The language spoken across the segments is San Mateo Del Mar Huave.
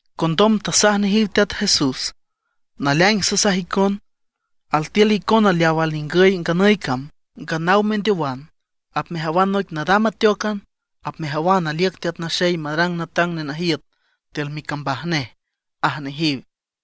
Condom tasaj nejiw Teat Jesús: ―Naleaing sasaj icon, altiül icona leaw alningüy nganüy cam, nganaw mendeowan apmejawan noic nadam ateócan, apmejawan aliüc Teat Naxey marang natang nenajiüt tiül micambaj nej ―aj nejiw.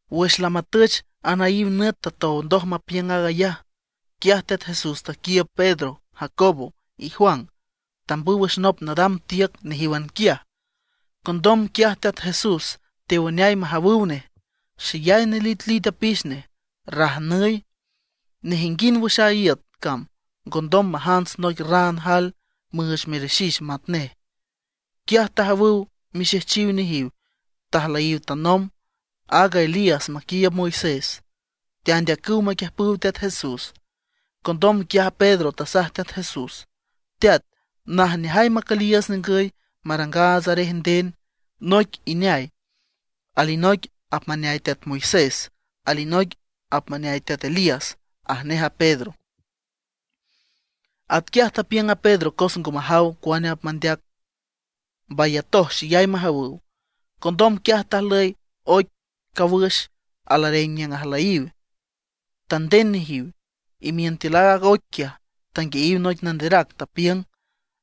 Wüx lamatüch anaíw nüt tatow ndoj mapiüng aag ayaj, quiaj Teat Jesús taquiiüb Pedro, Jacobo, y Juan, tambüw wüx nop nadam tiüc nejíwan quiaj. Condom quiaj Teat Jesús tewüneay majawüw nej. Xeyay nelitlit apix nej, rajnüy. Nejinguind wüx a iüt cam ngondom majants noic raan jael müüch merixix matnej. Quiaj tajawüw mixejchiw nejiw tajlüyiw tanomb, aaga Elías maquiiüb Moisés, teandeacüw maquiüjpüw Teat Jesús. Condom quiaj Pedro tasaj Teat Jesús: ―Teat, ¡najneajay macüliiüts ningüy, marangaats arej nden! Noic ineay, alinoic apmaneay teat Moisés, alinoic apmaneay teat Elías ―aj nej a Pedro. Atquiaj tapiüng a Pedro cos ngo majaw cuane apmandeac, mbayatoj xeyay majawüw. Condom quiaj tajlüy oic cawüx alareng niüng ajlüyiw, tanden nejiw. Imiün tiül aaga oic quiaj tanguiayiw noic nanderac, tapiüng: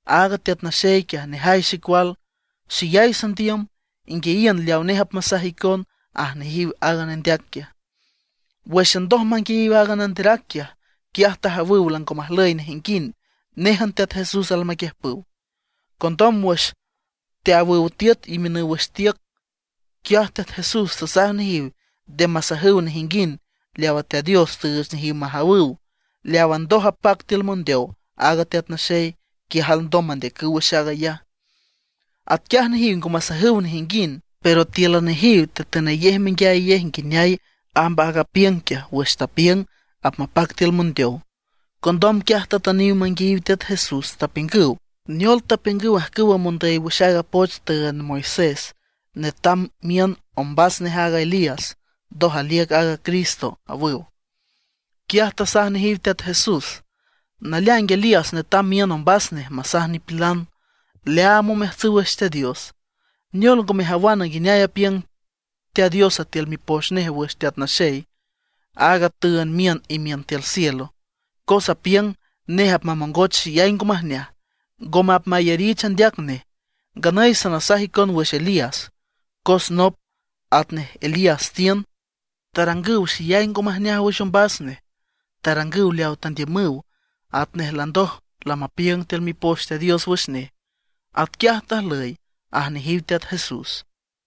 ―Aaga Teat Naxey quiaj nejay xecual, xeyay sandiüm. Inguiayiün leaw nej apmasaj icon ―aj nejiw aaga nendeac quiaj. Wǘxan ndoj manguiayiw aaga nanderac quiaj, quiaj tajawüw lango majlüy nejinguind, néjan Teat Jesús almaquiüjpüw. Condom wüx teawüw tiüt imiünüw wüx tiüc, quiaj Teat Jesús tasaj nejiw nde masajüw nejinguind leawa Teat Dios tüüch nejiw majawüw. Leawa ndoj apac tiül mondeow aaga Teat Naxey, quiaj alndom mandeacüw wüx aag ayaj. Atquiaj nejiw ngo masajüw nejinguind, pero tíülan nejiw tetünayej menguiayayej nguineay amb aaga apiüng quiaj wüx tapiüng apmapac tiül mondeow. Condom quiaj tatüniw manguiayiw Teat Jesús, tapiüngüw: ―¿Neol tapiüngüw ajcüw mondüy wüx aaga poch tüünd Moisés netam miün ombas nej aaga Elías, ndoj aliüc aaga Cristo? ―awüw. Quiaj tasaj nejiw Teat Jesús: ―Naleaing Elías netam miün ombas nej masaj nipilan leaam omeajtsüw wüx Teat Dios. ¿Neol ngo mejawana, nguineay apiüng Teat Dios tiül Mipoch nej wüx Teat Naxey, aaga tüünd miün imiün tiül cielo? Cos apiüng nej apmamongoch xeyay ngo majneaj, ngome apmayarich andeac nej. Nganüy sanasaj icon wüx Elías, cos nop atnej Elías tiün. Tarangüw xeyay ngo majneaj wüx ombas nej, tarangüw leawa tandiümüw. Atnej landoj lamapiüng tiül Mipoch Teat Dios wüx nej, atquiaj tajlüy ―aj nejiw Teat Jesús.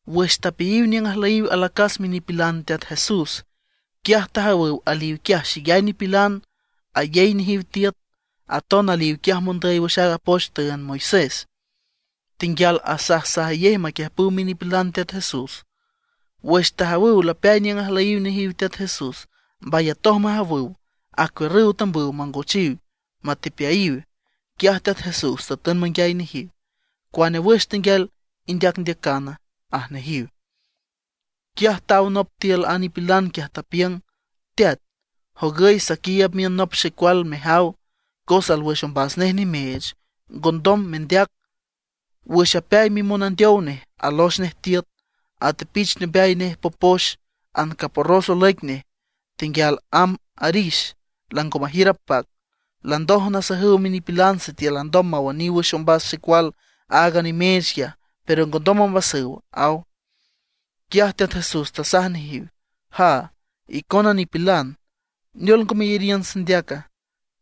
Wüx tapeayiw niüng ajlüyiw alacas minipilan Teat Jesús, quiaj tajawüw aliw quiaj xeyay nipilan ayey nejiw tiüt. Aton aliw quiaj mondüy wüx aaga poch tüünd a Moisés, tenguial asajsajayej maquiüjpüw minipilan Teat Jesús. Wüx tajawüw lapeay niüng ajlüyiw nejiw Teat Jesús, mbayatoj majawüw, acuiürrüw tambüw mangochiw matepeayiw. Quiaj Teat Jesús tatün manguiay nejiw: ―¿Cuane wüx tenguial indeacndeacana? ―aj nejiw. Quiaj taw nop tiül a nipilan quiaj, tapiüng: ―Teat, jogüy saquiiüb miün nop xecual mejaw, cos alwüx ombas nej nimeech, ngondom mendeac. Wüx apeay mimonandeow nej, alox nej tiüt, atepich teombeay nej popox, ancaporros olüic nej. Tenguial amb arix, lango majiür apac. Landoj nasajüw minipilan sitiül alndom mawüniw wüx ombas xecual aaga nimeech quiaj, pero ngondom ombasüw ―aw. Quiaj Teat Jesús tasaj nejiw: ―¡Jaa, icona nipilan! ¿Neol ngo meyariün sandeaca?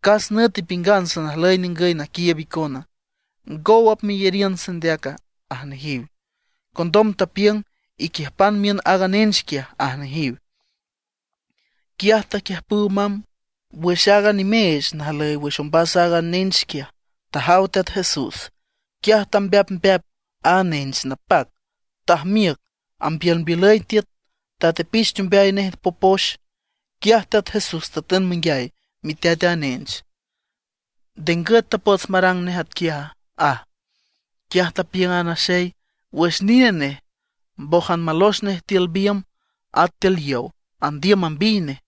¿Cas nüt ipiüngan sanajlüy ningüy naquiiüb icona? ¿Ngow apmeyariün sandeaca? ―aj nejiw. Condom tapiüng: ―Iquiüjpan miün aaga nench quiaj ―aj nejiw. Quiaj taquiüjpüw mamb. Wüx aaga nimeech najlüy wüx ombas a nench quiaj tajaw Teat Jesús, quiaj tambeapmbeap a nench napac, tajmiüc ambiülmbiülüy tiüt, tatepich teombeay nej popox. Quiaj Teat Jesús tatün manguiay miteat a nench: ―¿Nde ngüt tapots marang nej atquiaja? ―aj. Quiaj tapiüng a naxey: ―Wüx nine nej. Mbójan malox nej tiül biümb, at tiül yow, andiüm mambiy nej.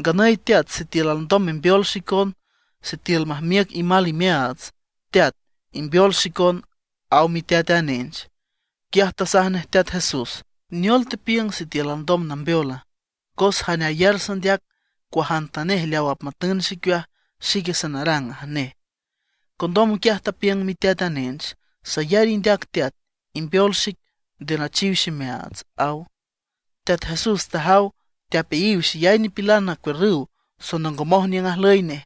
Nganüy Teat, sitiül alndom membeol xicon, sitiül majmiüc imal imeaats, Teat, imbeol xicon ―aw miteat a nench. Quiaj tasaj nej Teat Jesús: ―¿Neol tepiüng sitiül alndom nambeola? Cos jane ayar sandeac, cuajantanej leaw apmatün xicueaj, xique sanarang ―aj nej. Condom quiaj tapiüng miteat a nench: ―¡Sayar indeac teat, imbeol xic nde nachiw ximeaats! ―aw. Teat Jesús tajaw teapeayiw xeyay nipilan acuiürrüw sonongomoj niüng ajlüy nej.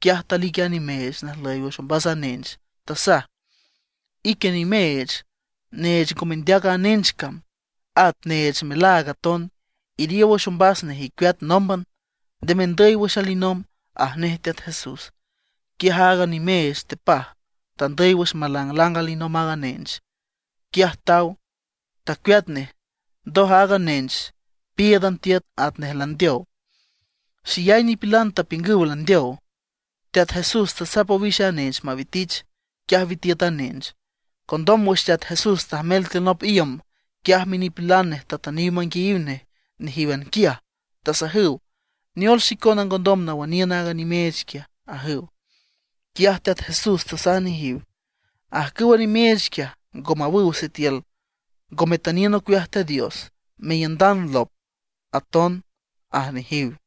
Quiaj talic a nimeech najlüy wüx ombas a nench. Tasaj: ―Ique nimeech, neech ngo mendeac a nench cam, at neech melaag aton, iriow wüx ombas nej, icueat nómban. ¡Nde mendüy wüx alinomb! ―aj nej Teat Jesús. Quiaj aaga nimeech tepaj, tandüy wüx malanglang alinomb aaga nench. Quiaj taw, tacueat nej. Ndoj aaga nench píiüdan tiüt atnej landeow. Xeyay nipilan tapiüngüw landeow. Teat Jesús tasap owix a nench mawitich. Quiaj witiüt a nench. Condom wüx Teat Jesús tajmel tiül nop iüm, quiaj minipilan nej tatüniw manguiayiw nej nejíwan quiaj, tasajüw: ―¿Neol xicona ngondom nawüniün aaga nimeech quiaj? ―ajüw. Quiaj Teat Jesús tasaj nejiw: ―Ajcüwa nimeech quiaj ngo mawüw sitiül ngo metüniün ocueaj Teat Dios, meiündan lop aton ―aj nejiw.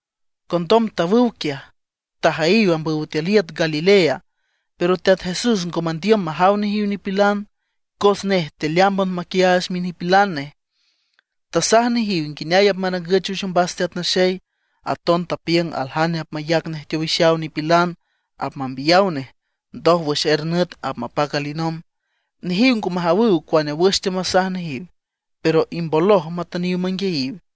Condom tawüw quiaj, tajüyiw ambüw tiül iüt Galilea. Pero Teat Jesús ngo mandiüm majaw nejiw nipilan, cos nej tealeámban maquiaach minipilan nej. Tasaj nejiw nguineay apmarangüch wüx Teat Naxey. Aton tapiüng aljane apmayac nej teowixaw nipilan, apmambiyaw nej, ndoj wüx er nüt apmapac alinomb. Nejiw ngo majawüw cuane wüx teamasaj nejiw, pero imboloj matüniw manguiayiw.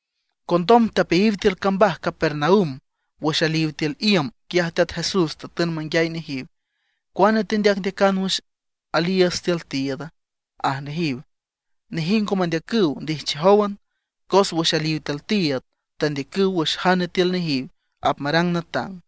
Condom tapeayiw tiül cambaj Capernaum. Wüx aliw tiül iüm, quiaj Teat Jesús tatün manguiay nejiw: ―¿Cuane tendeacndeacan wüx aliiüts tiül tiiüda? ―aj nejiw. Nejiw ngo mendeacüw, ndijchiüjówan, cos wüx aliw tiül tiiüd tandeacüw wüx jane tiül nejiw apmarang natang.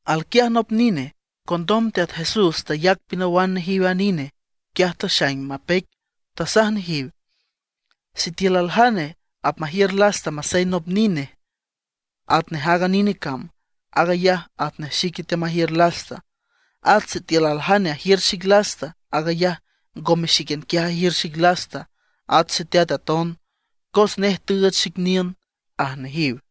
Alquiaj nop nine. Condom Teat Jesús tayac pinawan nejiw a nine. Quiaj taxaing mapeic, tasaj nejiw: ―Sitiül aljane apmajiür lasta masey nop nine atnej aaga nine cam, aag ayaj atnej xique teamajiür lasta. At sitiül aljane ajiür xic lasta, aag ayaj ngome xíquian quiaj ajiür xic lasta, at Xeteat aton, cos nej tüüch xic niün ―aj nejiw.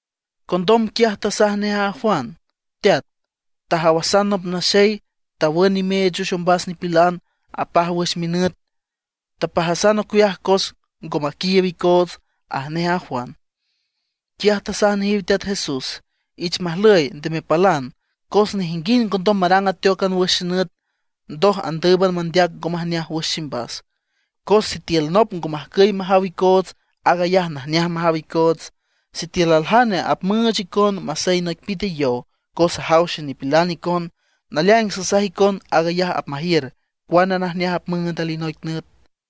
Condom quiaj tasaj nej a Juan: ―Teat, tajawasan nop naxey tawün nimeech wüx ombas nipilan, apaj wüx minüt. Tapajasan ocueaj cos ngo maquiiüb icoots ―aj nej a Juan. Quiaj tasaj nejiw Teat Jesús: ―Ich majlüy, nde mepalan. Cos nejinguind ngondom marang ateócan wüx xenüt, ndoj andǘüban mandeac ngo majneaj wüx ximbas. Cos sitiül nop ngo majcüy majaw icoots, aag ayaj najneaj majaw icoots. Sitiül aljane apmüüch icon masey noic pite yow, cos ajaw xenipilan icon, naleaing sasaj icon aag ayaj apmajiür cuane najneaj apmüünd alinoic nüt.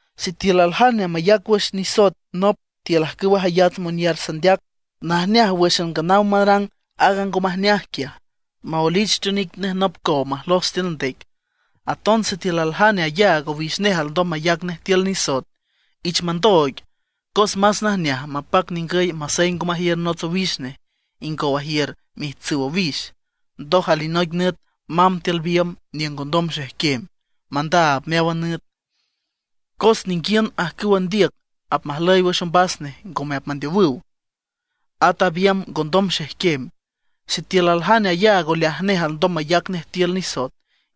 ’Sitiül aljane mayac wüx nisoet nop tiül ajcüwa jayats monyar sandeac, najneaj wǘxan nganaw marang aaga ngo majneaj quiaj maoelich teonic nej nop cow majlos tiül ndec. Aton sitiül aljane ayaag owix nej alndom mayac nej tiül nisoet, ich mandooig. Cos más najneaj mapac ningüy masey ngo majiür nots owix nej, ingow ajiür miijtsüw owix, ndoj alinoic nüt mamb tiül biümb niüng ngondom xejquem, mandaab meáwan nüt. Cos ninguiün ajcüwa ndiüc apmajlüy wüx ombas nej ngome apmandeowüw, at a biümb ngondom xejquem. Sitiül aljane ayaag oleaj nej alndom mayac nej tiül nisoet,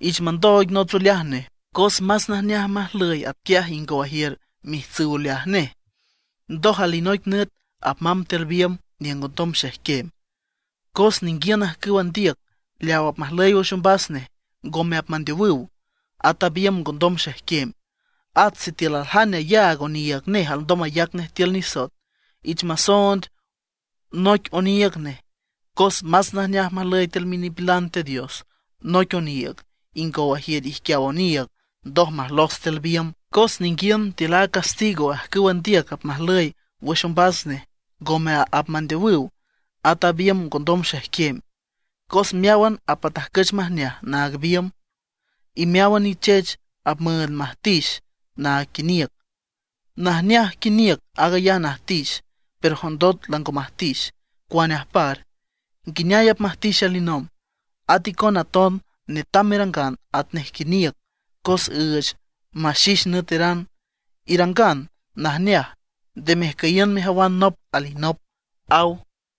ich mandooig nots oleaj nej. Cos más najneaj majlüy atquiaj ingow ajiür miijtsüw oleaj nej, ndoj alinoic nüt mamb tiül biümb niüng ngondom xejquem. Cos ninguiün ajcüwa ndiüc leaw apmajlüy wüx ombas nej ngome apmandeowüw, at a biümb ngondom xejquem. At sitiül aljane ayaag oniiüg nej alndom mayac nej tiül nisoet, ich masoond noic oniiüg nej. Cos más najneaj majlüy tiül minipilan Teat Dios noic oniiüg, ingow ajiür ijquiaw oniiüg ndoj majlos tiül biümb; cos ninguiün tiül a castigo ajcüwa ndiüc apmajlüy wüx ombas nej ngome apmandeowüw, at a biümb ngondom xejquem. ’Cos meáwan apmatajcüch majneaj naag biümb, y meáwan nichech apmüünd majtix naag quiniüc. Najneaj quiniüc aag ayaj najtix; pero jondot lango majtix, ¿cuane ajpar? ¿Nguineay apmajtix alinomb? At icona aton netam merangan atnej quiniüc cos üüch maxix nüeteran; irangan najneaj, nde mejcüyiün mejawan nop alinop ―aw.